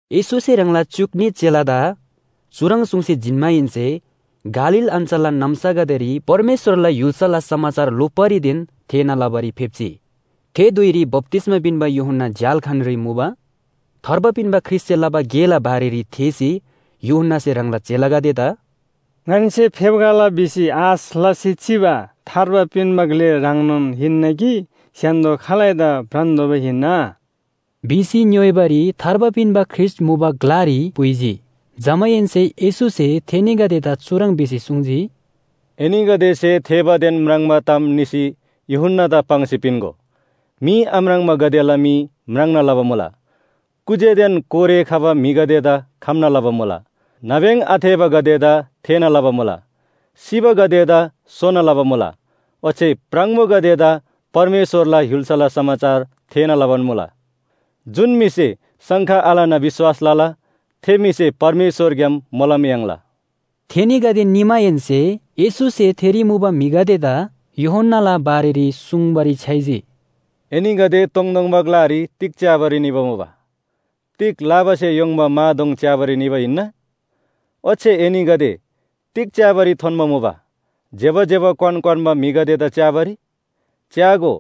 येशूसे ह्राङला च्‍युक न्‍ही चेलादा चुह्रङ् सुङ्सी जिन्‍माहेन्‍से गालील अञ्‍चलला नाम्‍सागदेरी परमेश्‍वरला य्‍हुल्‍साला समाचार लोप्‍बारीदेन थेःना लबारी फेप्‍जी। थे धुइरी बप्‍तिस्‍मा पिन्‍बा यूहन्‍ना झ्‍याल्‍खानरी मुबा। थार्बा पिन्‍बा ख्रीष्‍टसे लबा गेला बारेरी थेःसी यूहन्‍नासे ह्राङला चेलागदेदा “ङन्‍से फेप्‍खला भिसी आश लसी चिबा थार्बा पिन्‍बा ग्‍ले ह्राङनोन हिन्‍ना कि स्‍य्‍हान्‍दो खालैदा भ्रान्‍तोःबा हिन्‍ना?” भिसी ङ्‌योइबारी थार्बा पिन्‍बा ख्रीष्‍ट मुबा ग्‍लारी पुइजी। जमाहेन्‍से येशूसे थेनीगदेदा चुह्रङ् भिसी सुङ्जी, “एनीगदेसे थेःबादेन म्राङ्बा ताम निसी यूहन्‍नादा पाङ्सी पिन्‍गो। मी आम्राङ्बागदेला मी म्राङ्ना लबा मुला, कुज्‍यादेन कोरे खबा म्‍हिगदेदा खम्‍ना लबा मुला, नाब्‍यङ आथेःबागदेदा थेःना लबा मुला, सिबागदेदा सोना लबा मुला, ओच्‍छे प्राङबोगदेदा परमेश्‍वरला य्‍हुल्‍साला समाचार थेःना लबान मुला। जुन म्‍हिसे शङ्का आलना विश्‍वास लला, थे म्‍हिसे परमेश्‍वरग्‍याम मोलम याङ्ला।” थेनीगदे निमाहेन्‍से येशूसे थेरी मुबा म्‍हिगदेदा यूहन्‍नाला बारेरी सुङ्बारी छ्‌याइजी, “एनीगदे तोङतोङबा ग्‍लारी तिग च्‍याबारी निबा मुबा? तिग लाबासे य्‍होङ्बा मा दोङ च्‍याबारी निबा हिन्‍ना? ओच्‍छे एनीगदे तिग च्‍याबारी थोन्‍बा मुबा? ज्‍यबा ज्‍यबा क्‍वान क्‍वान्‍बा म्‍हिदा च्‍याबारी? च्‍यागो,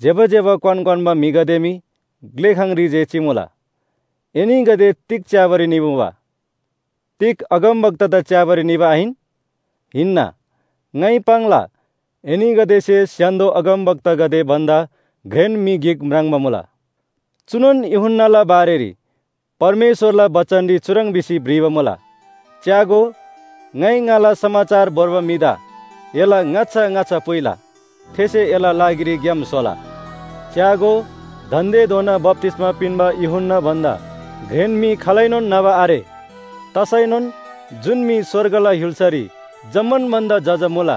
ज्‍यबा ज्‍यबा क्‍वान क्‍वान्‍बा म्‍हिगदे मी ग्‍लेखाङरी जे चिमुला। एनीगदे तिग च्‍याबारी निमुबा? तिग अगमवक्तादा च्‍याबारी निबा आहिन? हिन्‍ना, ङाइ पाङ्ला एनीगदेसे स्‍य्‍हान्‍दो अगमवक्तागदे भन्‍दा घ्रेन म्‍हि गिक म्राङ्बा मुला। चुनोन यूहन्‍नाला बारेरी परमेश्‍वरला बचनरी चुह्रङ् भिसी भ्रिबा मुला, ‘च्‍यागो, ङाइ ङाला समाचार भोर्बा म्‍हिदा एला ङाच्‍छा ङाच्‍छा पुइला। थेसे एला लागिरी ग्‍याम स्‍होला।’ “च्‍यागो, दान्‍देधोना बप्‍तिस्‍मा पिन्‍बा यूहन्‍ना भन्‍दा घ्रेन म्‍हि खालैनोन न्‍हबा आरे। तसैनोन जुन म्‍हि स्‍वर्गला य्‍हुल्‍सारी जम्‍मान भन्‍दा जजा मुला,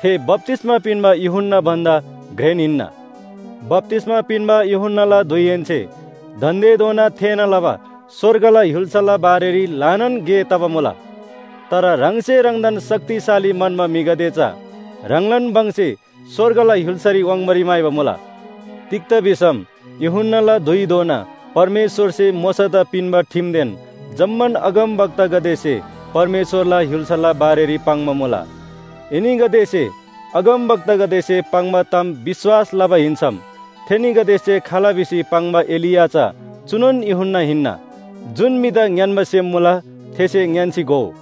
थे बप्‍तिस्‍मा पिन्‍बा यूहन्‍ना भन्‍दा घ्रेन हिन्‍ना। बप्‍तिस्‍मा पिन्‍बा यूहन्‍नाला धुइहेन्‍से दान्‍देधोना थेःना लबा स्‍वर्गला य्‍हुल्‍साला बारेरी ल्‍हानान गे तबा मुला। तर ह्राङसे ह्राङदान शक्तिशाली म्‍हन्‍बा म्‍हिगदे चा ह्राङलान भङसे स्‍वर्गला य्‍हुल्‍सारी वाङ्बारी म्‍हाइबा मुला। तिग्‍दा भिसम यूहन्‍नाला धुइधोना परमेश्‍वरसे मोशादा पिन्‍बा ठिमदेन जम्‍मान अगमवक्तागदेसे परमेश्‍वरला य्‍हुल्‍साला बारेरी पाङ्बा मुला। एनीगदेसे अगमवक्तागदेसे पाङ्बा ताम विश्‍वास लबा हिन्‍सम थेनीगदेसे खाल भिसी पाङ्बा एलिया चा चुनोन यूहन्‍ना हिन्‍ना। जुन म्‍हिदा ङ्‌यान्‍बा सेम मुला, थेसे ङ्‌यान्‍सी घोउ।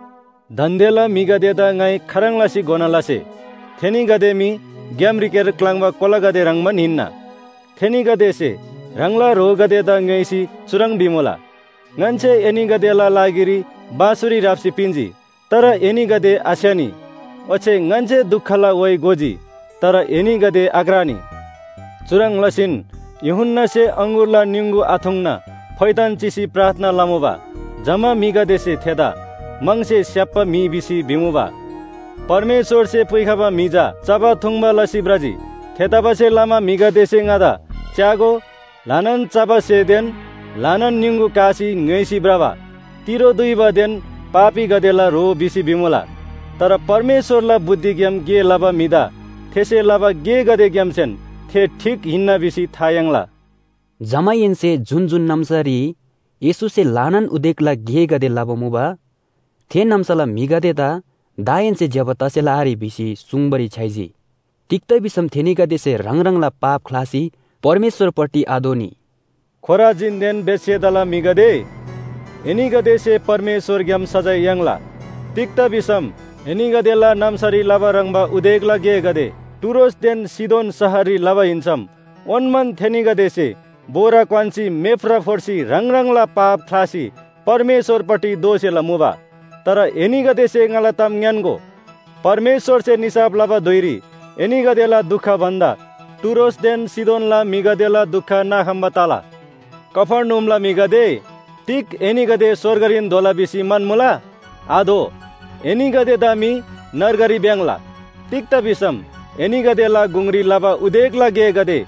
“दान्‍देला म्‍हिगदेदा ङाइ खाह्रङ् लसी घोना लसे? थेनीगदे मी ग्‍यामरीक्‍यार क्‍लाङ्बा कोलागदे ह्रङ्‌बान हिन्‍ना। थेनीगदेसे ह्राङला ह्रोगदेदा ङ्‌योइसी चुह्रङ् भिमुला, ‘ङन्‍से एनीगदेला लागिरी बाँसुरी ह्राप्‍सी पिन्‍जी, तर एनीगदे आस्‍य्‍हनी। ओच्‍छे ङन्‍से दुखला व्‍हाइ गोजी, तर एनीगदे आक्रानी।’ चुह्रङ् लसीन यूहन्‍नासे अङगुरला निङगु आथुङ्ना फोइथान चिसी प्रार्थना लमुबा, जमा म्‍हिगदेसे ‘थेदा म्‍हङसे स्‍याप्‍बा म्‍हि’ भिसी भिबा मुबा। परमेश्‍वरसे पुइखबा म्‍हि चा चबा थुङ्बा लसी भ्रजी। थेतबासेलमा म्‍हिगदेसे ङादा ‘च्‍यागो, ल्‍हानान चबा स्‍हेदेन ल्‍हानान निङगु कासी ङ्‌य्‍होइसी भ्रबा, तिरो दुइबादेन पापीगदेला ह्रो’ भिसी भिमुला! तर परमेश्‍वरला बुद्धिग्‍याम गे लबा म्‍हिदा थेसे लबा गेगदेग्‍यामसेन थे ठीक हिन्‍ना भिसी था याङ्ला।” जमाहेन्‍से जुन जुन नाम्‍सारी येशूसे ल्‍हानान उदेकला गेगदे लबा मुबा, थे नाम्‍साला म्‍हिगदेदा दाहेन्‍से ज्‍यबा तसेला आरे भिसी सुङ्बारी छ्‌याइजी, तिग्‍दा भिसम थेनीगदेसे ह्राङ ह्राङला पाप ख्‍लासी परमेश्‍वरपट्टि आदोःनी। “खोराजीनदेन बेथसेदाला म्‍हिगदे, एनीगदेसे परमेश्‍वरग्‍याम सजाय याङ्ला। तिग्‍दा भिसम एनीगदेला नाम्‍सारी लबा ह्रङ्‌बा उदेकला गेगदे टुरोसदेन सीदोन शहररी लबा हिन्‍सम ओन्‍मान थेनीगदेसे बोरा क्‍वान्‍सी मेफ्रा फोर्सी ह्राङ ह्राङला पाप ख्‍लासी परमेश्‍वरपट्टि दोःसेला मुबा। तर एनीगदेसे ङाला ताम ङ्‌यान्‍गो, परमेश्‍वरसे निसाफ लबा धुइरी एनीगदेला दुख भन्‍दा टुरोसदेन सीदोनला म्‍हिगदेला दुख नाखम्‍बा तला कफर्नहुमला म्‍हिगदे, तिग एनीगदे स्‍वर्गरीन धोला भिसी म्‍हन्‍मुला? आधो! एनीगदेदा मी नर्गरी भ्‍याङ्‍ला। तिग्‍दा भिसम एनीगदेला गुङरी लबा उदेकला गेगदे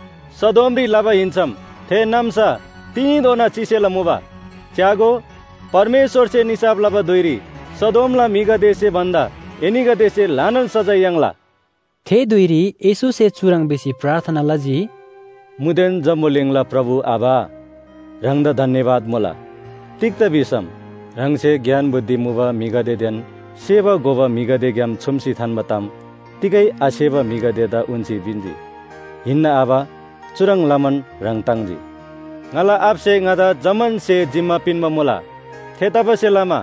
सदोमरी लबा हिन्‍सम थे नाम्‍सा तिनीधोना चिसेला मुबा। च्‍यागो, परमेश्‍वरसे निसाफ लबा धुइरी सदोमला म्‍हिगदेसे भन्‍दा एनीगदेसे ल्‍हानान सजाय याङ्ला?” थे धुइरी येशूसे चुह्रङ् भिसी प्रार्थना लजी, “मुदेन जम्‍बुलिङला प्रभु आबा, ह्राङदा धन्‍यवाद मुला, तिग्‍दा भिसम ह्राङसे ज्ञान बुद्धि मुबा म्‍हिगदेदेन सेबा घोबा म्‍हिगदेग्‍याम छुम्‍सी थान्‍बा ताम तिगै आसेबा म्‍हिगदेदा उन्‍सी पिन्‍जी। हिन्‍ना आबा, चुह्रङ् लमान ह्राङ ताङ्जी। “ङाला आबासे ङादा जम्‍मान स्‍हे जिम्‍मा पिन्‍बा मुला। थेतबासेलमा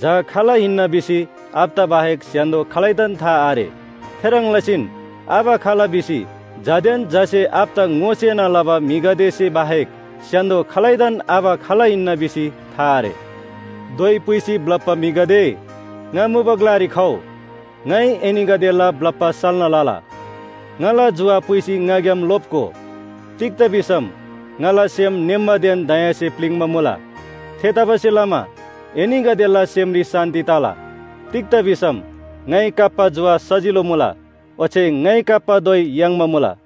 झा खाल हिन्‍ना भिसी आबादा बाहेक स्‍य्‍हान्‍दो खालैदान था आरे। थेह्रङ् लसीन आबा खाल भिसी झादेन झासे आबादा ङोसेना लबा म्‍हिगदेसे बाहेक स्‍य्‍हान्‍दो खालैदान आबा खाल हिन्‍ना भिसी था आरे। “धोइ पुइसी ब्‍लप्‍बा म्‍हिगदे, ङा मुबा ग्‍लारी खउ, ङाइ एनीगदेला ब्‍लप्‍बा साल्‍ना लला। ङाला जुवा पुइसी ङाग्‍याम लोप्‍गो, तिग्‍दा भिसम ङाला सेम ङेम्‍बादेन दयासे प्‍लिङ्बा मुला। थेतबासेलमा एनीगदेला सेमरी शान्‍ति तला। तिग्‍दा भिसम ङाइ काप्‍बा जुवा सजिलो मुला, ओच्‍छे ङाइ काप्‍बा धोइ याङ्बा मुला।”